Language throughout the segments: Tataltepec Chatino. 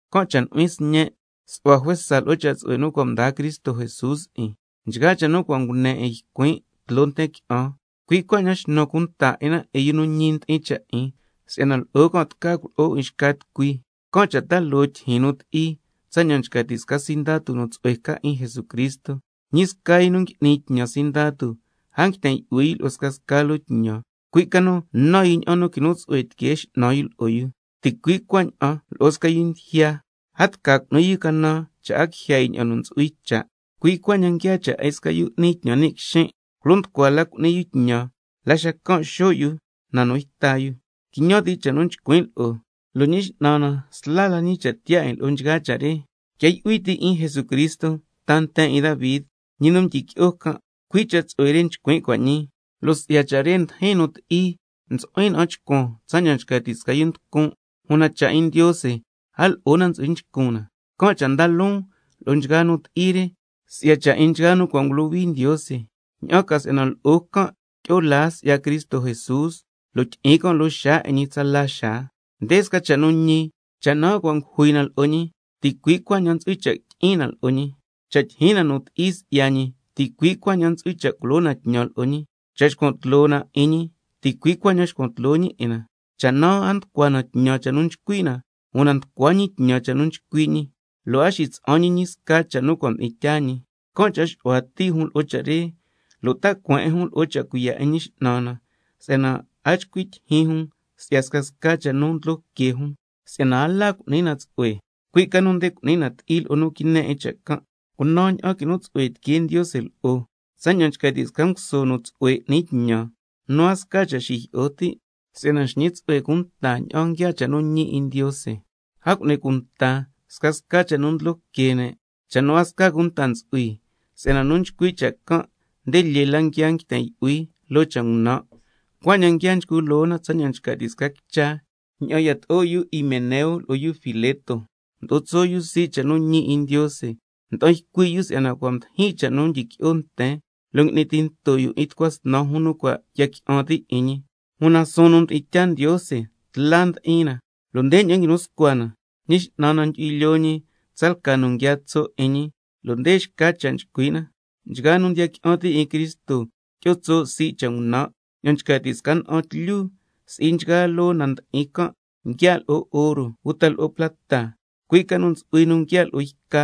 Can' cha' nu'huin sñen', su'hua juesa lo'o cha' tsu'hue nu cua' mdaa Cristo Jesús 'in. Nchgaa cha' nu cua' ngune 'in ycuin' tloo nten qui'an can', cui' cuaña'an xnu cunta 'in na 'in yu nu ñi ndi'in cha' 'in, si'yana lo'o can' tca culo'o 'in xca tucui. Can' cha' ta loo tyijyin nu ti'i tsaña'an nchca ti' sca sindatu nu tsu'hue ca 'in Jesucristo. Ñi sca yu ngui'ni tñan sindatu, a nguiten yu'hui yu lo'o scasca loo tñan, cui' ca nu nan yu ña'an nu quinu tsu'hue tiquee x'nan yu lo'o yu. Ticui' cuaña'an lo'o sca yu ndijya, a tca cu'ni yu canan cha' a quijya yu ña'an nu ntsu'hui cha'. Cui' cuaña'an nguiaa cha' 'in sca yu n'ni tñan ni' quixin', culo nducua la cu'ni yu tñan, la xacan' xo' yu na nu yta yu. Quiñan ti' cha' nu nchcuin' lo'o, lo' Ñi X'nan na sla la ñi cha' tiyaa 'in lo'o nchgaa cha' re. Quia yu'hui ti' 'in Jesucristo, ta nten 'in Davi, ñi nu mdyiqui'o can', cui' cha' tsu'hue re nchcuin' cua' ñii, lo' si'ya cha' re ndijin nu ti'i, ntsu'huin na'an chcuan tsaña'an nchca ti' sca yu nducun', una cha' 'in Ndiose a lo'o na ntsu'hui nchcun na. Can' cha' nda loon lo'o nchgaa nu ti'i re, si'ya cha' 'in nchgaa nu cua' ngulohui Ndiose, ña'an ca si'yana lo'o can' tyi'o laa si'ya Cristo Jesús, lo' tyi'in can' loo xaa 'in ñi tsala xaa. Nde sca cha' nu ñi: Cha' naa cua' ngujui na lo'o ñi, ticui' cuaña'an ntsu'hui cha' tyi'in na lo'o ñi. Cha' tyijyin na nu ti'i si'ya ñi, ticui' cuaña'an ntsu'hui cha' culo na tñan lo'o ñi. Cha' xcuan tloo na 'in ñi, ticui' cuaña'an xcuan tloo ñi 'in na. Cha' naa a nducua na tñan cha' nu nchcui' na, una nducua ñi tñan cha' nu nchcui' ñi, si'yana a ntsu'hui cha' xitsa'an ñi sca cha' nu cua' mdi'in tyaa ñi. Can' cha' xu'hua ti' jun lo'o cha' re, lo' ta cueen 'in jun lo'o cha' cuiya' 'in Ñi X'nan na si'yana a chcui' tyijyin jun si'ya scasca cha' nu ndlo que jun, si'yana a la cu'ni na tsu'hue, cui' ca nu nde cu'ni na ti'i lo'o nu quine 'in cha' can'. Su'hua juesa nu quinu tsu'hue tiquee Ndiose lo'o, tsaña'an nchca ti' sca nguso nu tsu'hue n'ni tñan, nu a sca cha' xijyi'o ti', si'yana nxñi tsu'hue cunta ña'an nguiaa cha' nu ñi 'in Ndiose. A cu'ni cunta scasca cha' nu ndlo que ne', cha' nu a sca cunta ntsu'hui, si'yana nu nchcui' cha' can' nde lyee la nguia nguiten yu'hui loo cha' ngunan', cuaña'an nguia nchcu loo na tsaña'an nchca ti' sca quicha, cui' cha' re yato'o 'in yu Himeneo lo'o yu Fileto, mdo'o tso' yu sii' cha' nu ñi 'in Ndiose, nda'an ycui' yu si'yana cua' mdijin cha' nu tyiqui'o nten, lo' ngui'ni tinto yu 'in tucua snan jun nu cua' ya qui'an ti' 'in ñi. Una suun nu mdi'in tyaa Ndiose tla ndi'in na, lo' ndeña'an nguinu scua cha' nu nchcui' na: —Ñi X'nan na ndyu'hui lyoo ñi tsalca nu nguiaa tso' 'in ñi—, lo' nde xca cha' nchcui' na: —Nchgaa nu ndiya qui'an ti' 'in Cristo tyi'o tso' sii' cha' ngunan'—. Ña'an nchca ti' sca na'an tlyu, si'i nchgaa loo na ndi'in can' nguia' lo'o oro uta lo'o plata, cui' ca nu ntsu'hui nu nguia' lo'o yca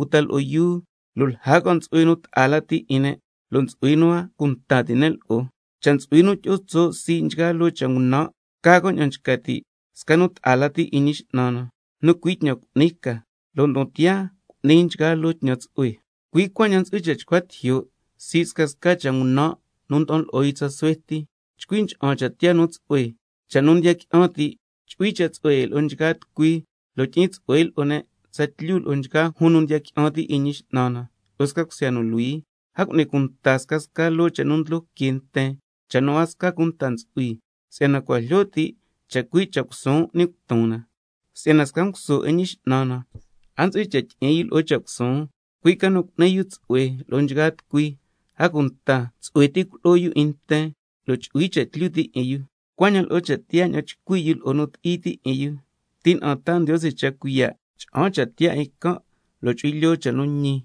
uta lo'o yuu, lo' lja can' ntsu'hui nu ta'a lati 'in ne', lo' ntsu'hui nu a cunta ti' ne' lo'o. Can' cha', cha' ntsu'hui nu tyi'o tso' sii' nchgaa loo cha' ngunan', ca can' ña'an nchca ti' sca nu ta'a lati 'in Ñi X'nan na, nu cui' tñan cu'ni ca, lo' ndon tiyaa can' cu'ni nchgaa loo tñan tsu'hue. Cui' cuaña'an ntsu'hui cha' chcua tijyo' sii' scasca cha' tiyaa ngunan' nu nda'an lo'o yu tsa suhue ti, chcui ncha'an cha' tiyaa nu tsu'hue, cha' nu ndiya qui'an ti', chu'hui cha' tsu'hue 'in lo'o nchgaa tucui, lo' tyi'in tsu'hue lo'o ne' tsatlyu lo'o nchgaa jun nu ndiya qui'an ti' 'in Ñi X'nan na lo'o sca cusya nu luhui. A cu'ni cunta scasca loo cha' nu ndlo que nten, cha' nu a sca cunta ntsu'hui, si'yana cua' jlyo ti' chacui' cha' cusuun n'ni cuton na. Si'yana sca nguso 'in Ñi X'nan na, a ntsu'hui cha' tyi'in yu lo'o cha' cusuun, cui' ca nu nde cu'ni yu tsu'hue lo'o nchgaa tucui, a cunta tsu'hue ti culo'o yu 'in nten, lo' chu'hui cha' tlyu ti' 'in yu, cuaña'an lo'o suun ña'an chcui' yu lo'o nu ti'i ti' 'in yu, tina'an taa Ndiose cha' cuiya' cha'an cha' tiyaa 'in can', lo' chu'hui lyoo cha' nu ñi,